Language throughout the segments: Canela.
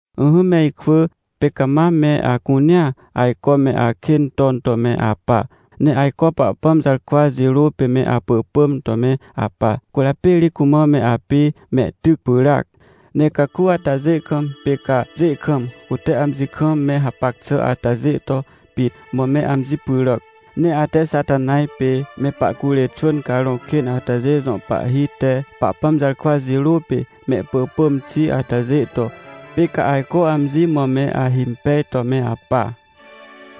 Ỹhỹ me ikwỳ, pê ca mam me acunea ajco me akên ton to me apa, ne ajco Pahpãm jarkwa jirô pê me apỳpỳm to me apa, cwỳrjapê ri cumã me apê mehtyc pyràac. Ne caku atajê kam pê ca pjê kam, cute amji kam me hapac xà atajê to pit mã me amji pyràc. Ne ate Xatanaj pê me pahcurê xwỳn carõ kên atajê jõ pahhi te, Pahpãm jarkwa jirô pê mehpỳpỳm xi atajê to, pê ca ajco amji mã me ahimpej to me apa.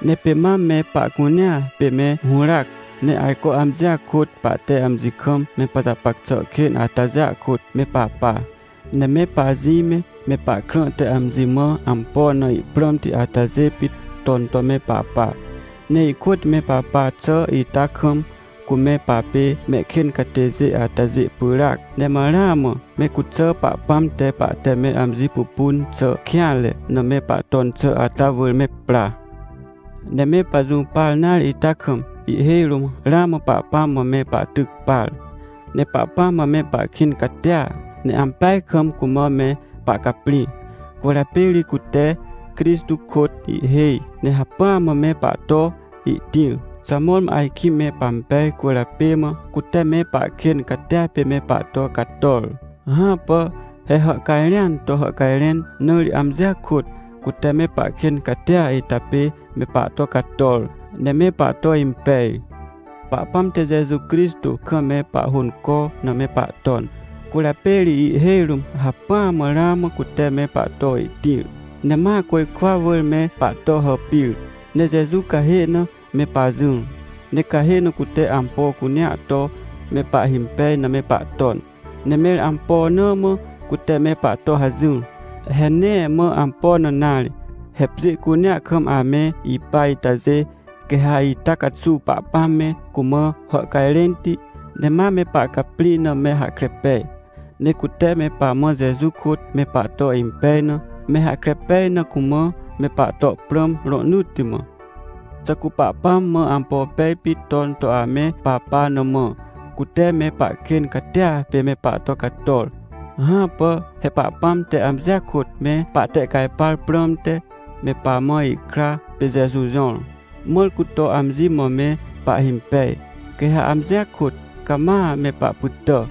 Ne pê mam me pahcunea pê me hũràac, ne ajco amjia kôt pahte amji kam me pajapac xà kên atajêa kôt, me papa. Ne me pajĩ me, me pahkrã te amji mã ampo na ihprãmti atajê pit ton to me papa. Ne ihkôt me papa xà ita kam, cu me papê mehkên catêjê atajê pyràac, ne ma ramã me cuxà Pahpãm te pahte me amji pupun xà kêanre na me pahton xà ata wỳr me pra. Ne me pajũpar nare ita kam, ihhêj rũm ramã Pahpãm mã me pahtyc par. Ne Pahpãm mã me pahkĩn catia, ne ampeaj kam cumã me pahcaprĩ. Cwỳrjapê ri cute Crixtô kôt ihhêj ne hacpỹa mã me pahto ihtĩr. Xà mõrmõ ajkĩ me pampej cwỳrjapê mã, cute me pahkên catia pê me pahto cator? Hãpà! He hàhcajrẽan to hàhcajrẽn na ri amjia kôt, cute me pahkên catia ita pê me pahto cator, ne me pahto impej. Pahpãm te Jeju Crixtô kam me pahhônco na me pahton. Cwỳrjapê ri ihhêj rũm hacpỹa mã ramã cute me pahto ihtĩr, ne ma côjkwa wỳr me pahto hàpir, ne Jeju cahê na me pajỹr, ne cahê na cute ampo cunea to me pahhimpej na me pahton. Ne mẽr ampo na mã cute me pahto hajỹr? He nee mã ampo na nare! He pjê cunea kam ame ipa itajê, quê ha ita caxuw Pahpãm me cumã hàhcajrẽnti, ne ma me pahcaprĩ na me hahkre pej. Ne cute me pamã Jeju kôt me pahto impej na, me hahkre pej na cumã me pahto prãm, rohnỳtti mã. Xà cu Pahpãm mã ampo pej pit ton to ame papa na mã, cute me pahkên catia pê me pahto cator? Hãpà! He Pahpãm te amjia kôt, me pahtehcajpar prãmte, me pamã ihkra pê Jeju jõr, mãr cu to amji mã me pahhimpej, quê ha amjia kôt cama me pahpytà.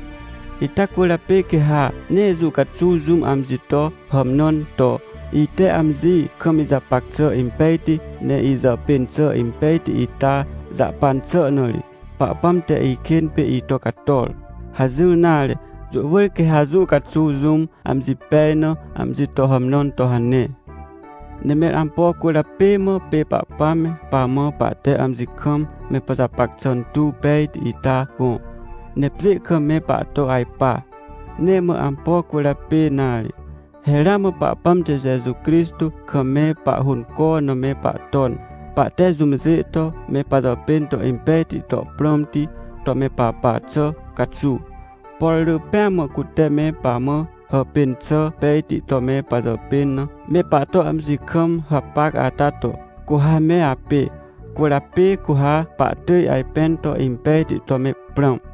Ita cwỳrjapê quê ha nee jũ caxuw jũm amji to hàmnãn to: — Ite amji kam ijapac xà impejti, ne ijàpên xà impejti ita jahpan xà na ri, Pahpãm te ikên pê ito cator — hajỹr nare. Jũ wỳr quê ha jũ caxuw jũm amji pej na amji to hàmnãn to hane. Ne mẽr ampo cwỳrjapê mã pê Pahpãm me pamã pahte amji kam me pajapac xà tuw pejti ita gõ, ne pjê kam me pahto ajpa? Nee mã ampo cwỳrjapê nare. He ramã Pahpãm te Jeju Crixtô kam me pahhônco na me pahton, pahte jũmjê to me pajapên to impejti to prãmti to me papa xà caxuw. Por rỳ pêa mã cute me pamã hàpên xà pejti to me pajàpên na, me pahto amji kam hapac ata to, cu ha me apê. Cwỳrjapê cu ha pahtỳj ajpẽn to impejti to me prãm.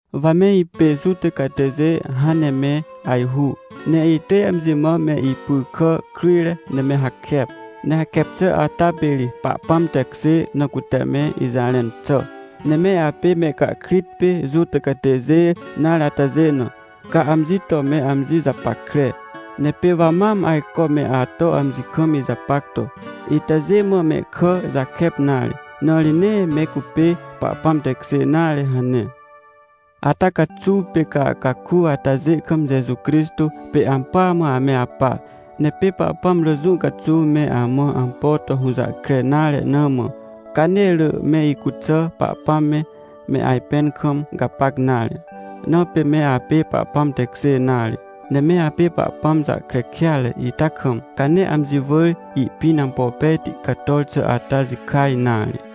Wa me ipê Juta catêjê hãn ne me ajhu, ne itỳj amji mã me ipy kà kryjre ne me hakep. Ne hakep xà ata pê ri Pahpãm tekjê na cute me ijarẽn xà. Ne me apê mehcahkrit pê Juta catêjê nare atajê na, ca amji to me amji japackre. Ne pê wa mam ajco me ato amji kam ijapac to: — Itajê mã mehkà jakep nare, na ri nee me cupê Pahpãm tekjê nare — hane. Ata caxuw pê ca caku atajê kam Jeju Crixtô pê ampỳa mã ame apa. Ne pê Pahpãm rỳ jũ caxuw me amã ampo to hũjahkre nare na mã, ca nee rỳ me icuxà Pahpãm me, me ajpẽn kam gapac nare. Na pê me apê Pahpãm tekjê nare, ne me apê Pahpãm jahkre kêatre ita kam, ca nee amji wỳr ihpĩn ampo pejti cator xà ata jikaj nare.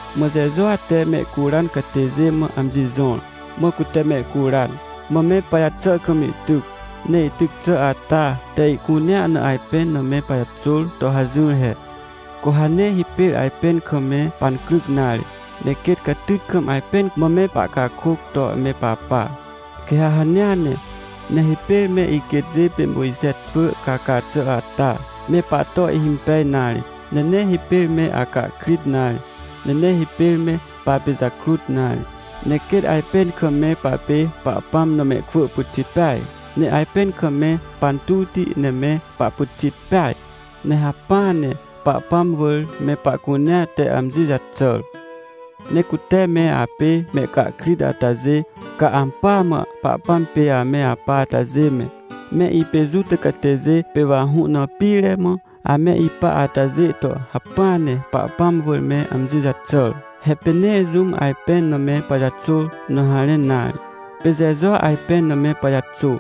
Mã Jejua te mehcuran catêjê mã amji jõr, mã cute mehcuran, mã me pajaxà kam ihtyc. Ne ihtyc xà ata te ihcunea na ajpẽn na me pajaxôr to hajỹr he. Cu ha nee hipêr ajpẽn kam me pancryc nare, ne quêt catyt kam ajpẽn mã me pahcakôc to me papa. Quê ha hanea ne, nee hipêr me iquêtjê pê Mojxe xwỳ caca xà ata, me pahto ihhimpej nare. Ne nee hipêr me acahkrit nare, ne nee hipêr me papijakrut nare, ne quêt ajpẽn kam me papê Pahpãm na mehkwỳ pyxit peaj, ne ajpẽn kam me pantuwti, ne me pahpyxit peaj. Ne hacpỹa ne Pahpãm wỳr me pahcunea te amji jaxàr. Ne cute me apê mehcahkrit atajê, ca ampỳa mã Pahpãm pê ame apa atajê me, me ipê Juta catêjê, pê wa hũ na pire mã ame ipa atajê to hacpỹa ne Pahpãm wỳr me amji jaxàr. He pê nee jũm ajpẽn na me pajaxôr na harẽn nare. Pê Jejua ajpẽn na me pajaxô.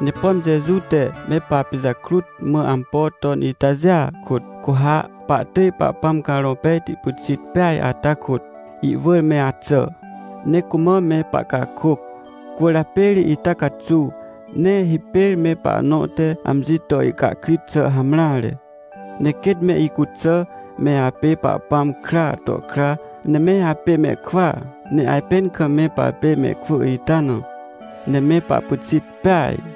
Ne pom Jeju te me papijakrut mã ampo ton itajêa kôt, cu ha pahtỳj Pahpãm Carõ Pejti pyxit peaj ata kôt, ihwỳr me axà, ne cumã me pahcakôc. Cwỳrjapê ri ita caxuw, nee hipêr me pahnõ te amji to ihcahkrit xà hamreare. Ne quêt me icuxà me apê Pahpãm kraa to kra, ne me apê mehkwỳa, ne ajpẽn kam me papê mehkwỳ ita na, ne me pahpyxit peaj.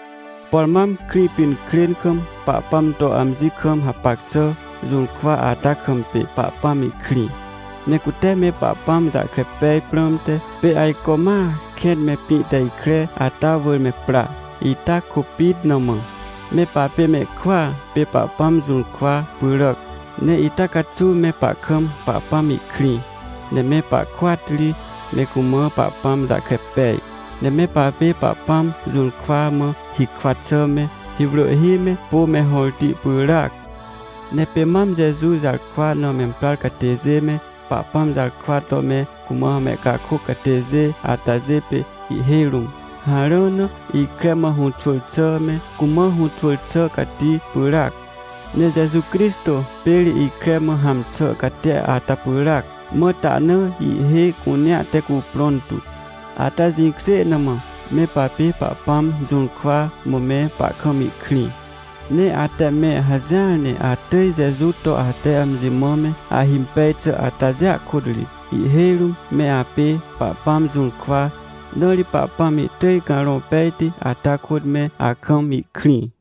Por mam Krĩpinkrên kam, Pahpãm to amji kam hapac xà jũrkwa ata kam pê Pahpãm ihkrĩ. Ne cute me Pahpãm jahkre pej prãmte, pê ajco ma kẽn me pĩ te ikre ata wỳr me pra. Ita kôpit na mã, me papê mehkwỳa pê Pahpãm jũrkwa pyràac. Ne ita caxuw me pahkam Pahpãm ihkrĩ, ne me pahkôat ri me cumã Pahpãm jahkre pej. Ne me papê Pahpãm jũrkwa mã hikwa xà me, hiwrỳhhi me, pô me hõrti pyràac. Ne pê mam Jeju jarkwa na memprar catêjê me, Pahpãm jarkwa to me cumã mehcakôc catêjê atajê pê ihhêj rũm, harã na ikre mã hũxwỳr xà me, cumã hũxwỳr xà cati pyràac. Ne Jeju Crixtô pê ri ikre mã hãm xà catia ata pyràac, mã tahna ihhê cunea te cuprõn tu. Ata jĩkjê na mã me papê Pahpãm jũrkwa, mã me pahkam ihkrĩ. Ne ate me hajỹar ne atỳj Jeju to ate amji mã me ahimpej xà atajêa kôt ri ihhêj rũm me apê Pahpãm jũrkwa, na ri Pahpãm ihtỳj Carõ Pejti ata kôt me akam ihkrĩ.